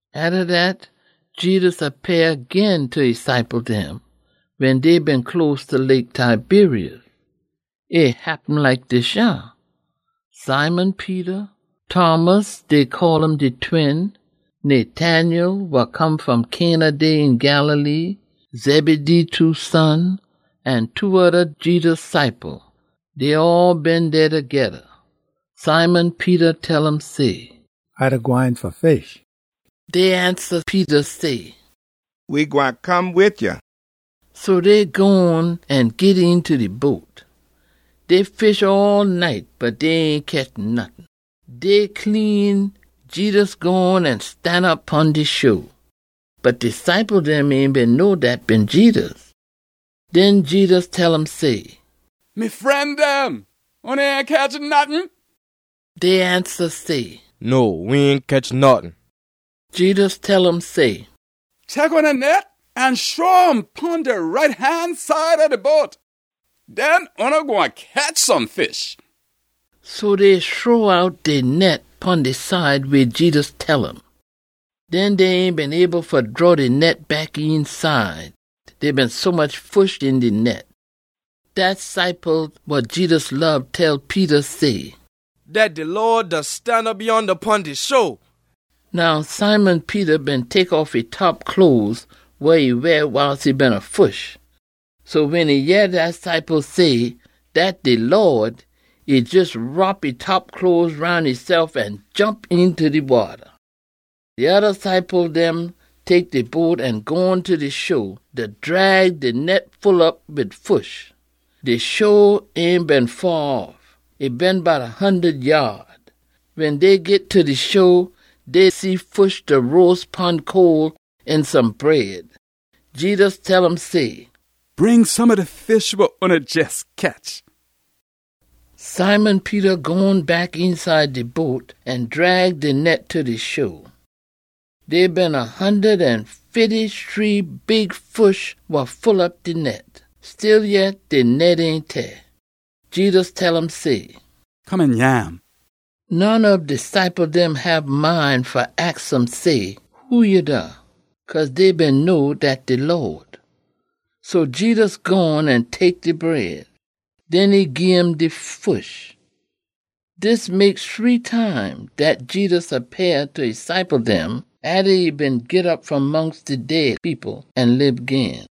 Atta dat, Jedus appeah gin ta e ciple dem, wen dey been close ta Lake Tiberias. E happen like dis yah: Simon Peter, Thomas (dey call um de Twin), Nathanael wa come fom Cana dey een Galilee, Zebedee two son, an two oda Jedus ciple, dey all been dey togeda. Simon Peter tell um say, “A da gwine fa fish.” Dey ansa Peter say, “We gwine come wid ya.” So dey gone an git eenta de boat. Dey fish all night bot dey ain ketch nottin. Day clean, Jedus gone an stanop pon de sho. Bot de ciple dem ain been know dat been Jedus. Den Jedus tell um say, “Me fren dem, oona ain ketch nottin?” Dey ansa say, “No, we ain ketch nottin.” Jedus tell um say, “Tek oona net an shrow um pon de right han side ob de boat. Den oona gwine ketch some fish.” So dey shrow out dey net pon de side weh Jedus tell um. Den dey ain been able fa draw de net back eenside, dey been sommuch fish een de net. Dat ciple wa Jedus lob tell Peter say, “Dat de Lawd da stanop yonda pon de sho!” Now Simon Peter been tek off e top cloes wa e weah wiles e beena fish. So wen e yeh dat ciple say, “Dat de Lawd,” e jes wrop e top cloes roun esef an jomp eenta de wata. De oda ciple dem tek de boat an gone ta de sho, da drag de net full op wid fish. De sho ain been faa off. E been bout a hundud yaad. Wen dey git ta de sho, dey see fish da roas pon coal, an some bread. Jedus tell um say, “Bring some ob de fish wa oona jes ketch.” Simon Peter gone back eenside de boat an drag de net ta de sho. Dey been a hundud an fifty-shree big fish wa full op de net. Stillyet, de net ain teah. Jedus tell um say, “Come an nyam.” None ob de ciple dem hab mind fa aks um say, “Who ya da?” cause dey been know dat de Lawd. So Jedus gone an tek de bread. Den e gim de fish. Dis mek shree time dat Jedus appeah ta e ciple dem, atta e been git op fom mongst de dead people an lib gin.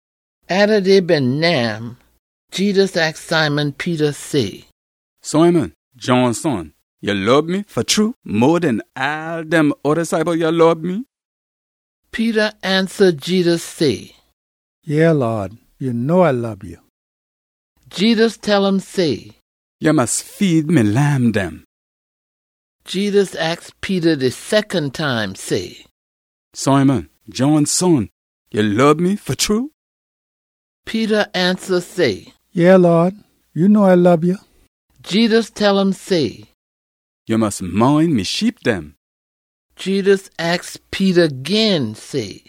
Atta dey been nyam, Jedus aks Simon Peter say, “Simon, John son, ya lob me fa true mo den all dem oda ciple yah lob me?” Peter ansa Jedus say, “Yeah, Lawd, ya know A lob ya.” Jedus tell um say, “Ya mus feed me lamb dem.” Jedus aks Peter de secon time say, “Simon, John son, ya lob me fa true?” Peter ansa say, “Yeah, Lawd, ya know A lob ya.” Jedus tell um say, “Ya mus mind me sheep dem.” Jedus aks Peter gin say,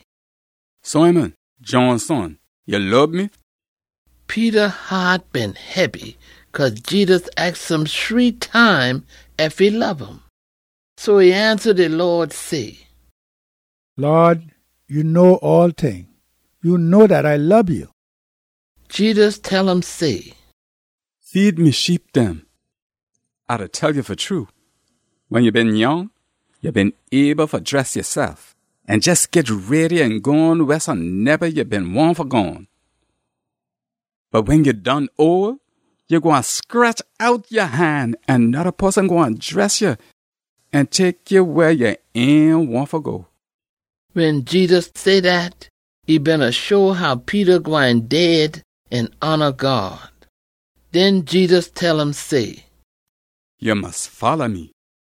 “Simon, John son, ya lob me?” Peter haat been hebby cause Jedus aks um shree time ef e lob um. So e ansa de Lawd say, “Lawd, ya know all ting. Ya know dat A lob ya!” Jedus tell um say, “Feed me sheep dem. A da tell ya fa true, wen ya been nyoung, ya been able fa dress yasef, an jes git ready an gone wehsoneba ya been wahn fa gone. Bot wen ya done ole, ya gwine scretch out ya han, an noda poson gwine dress ya an tek ya weh ya ain wahn fa go.” (Wen Jedus say dat, e beena show how Peter gwine dead an hona God.) Den Jedus tell um say, “Ya mus folla me!”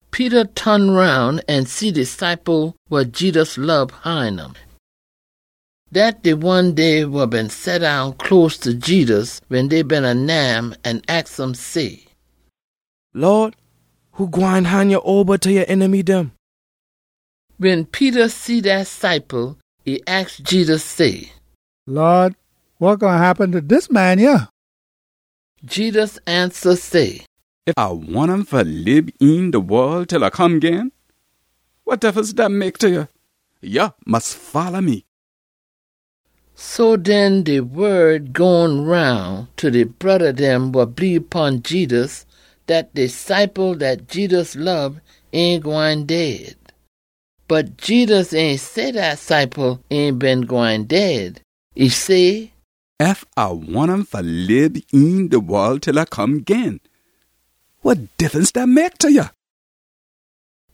Peter ton roun an see de ciple wa Jedus lob hine um. Dat de one dey wa been seddown close ta Jedus wen dey beena nyam an aks um say, “Lawd, who gwine han ya oba ta ya enemy dem?” Wen Peter see dat ciple, e aks Jedus say, “Lawd, wa gwine happen ta dis man yah?” Jedus ansa say, “Ef A wahn um fa lib een de wol til A come gin, wa diffunce dat mek ta ya? Ya mus folla me!” So den, de wod gone roun ta de broda dem wa bleebe pon Jedus dat de ciple dat Jedus lob ain gwine dead. Bot Jedus ain say dat ciple ain been gwine dead. E say, “Ef A wahn um fa lib een de wol til A come gin, wa diffunce dat mek ta ya?”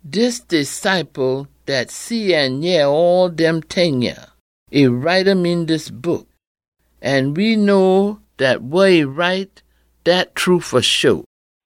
Dis de ciple dat see an yeh all dem ting yah. E write um een dis book. An we know dat wa e write, dat true fa sho.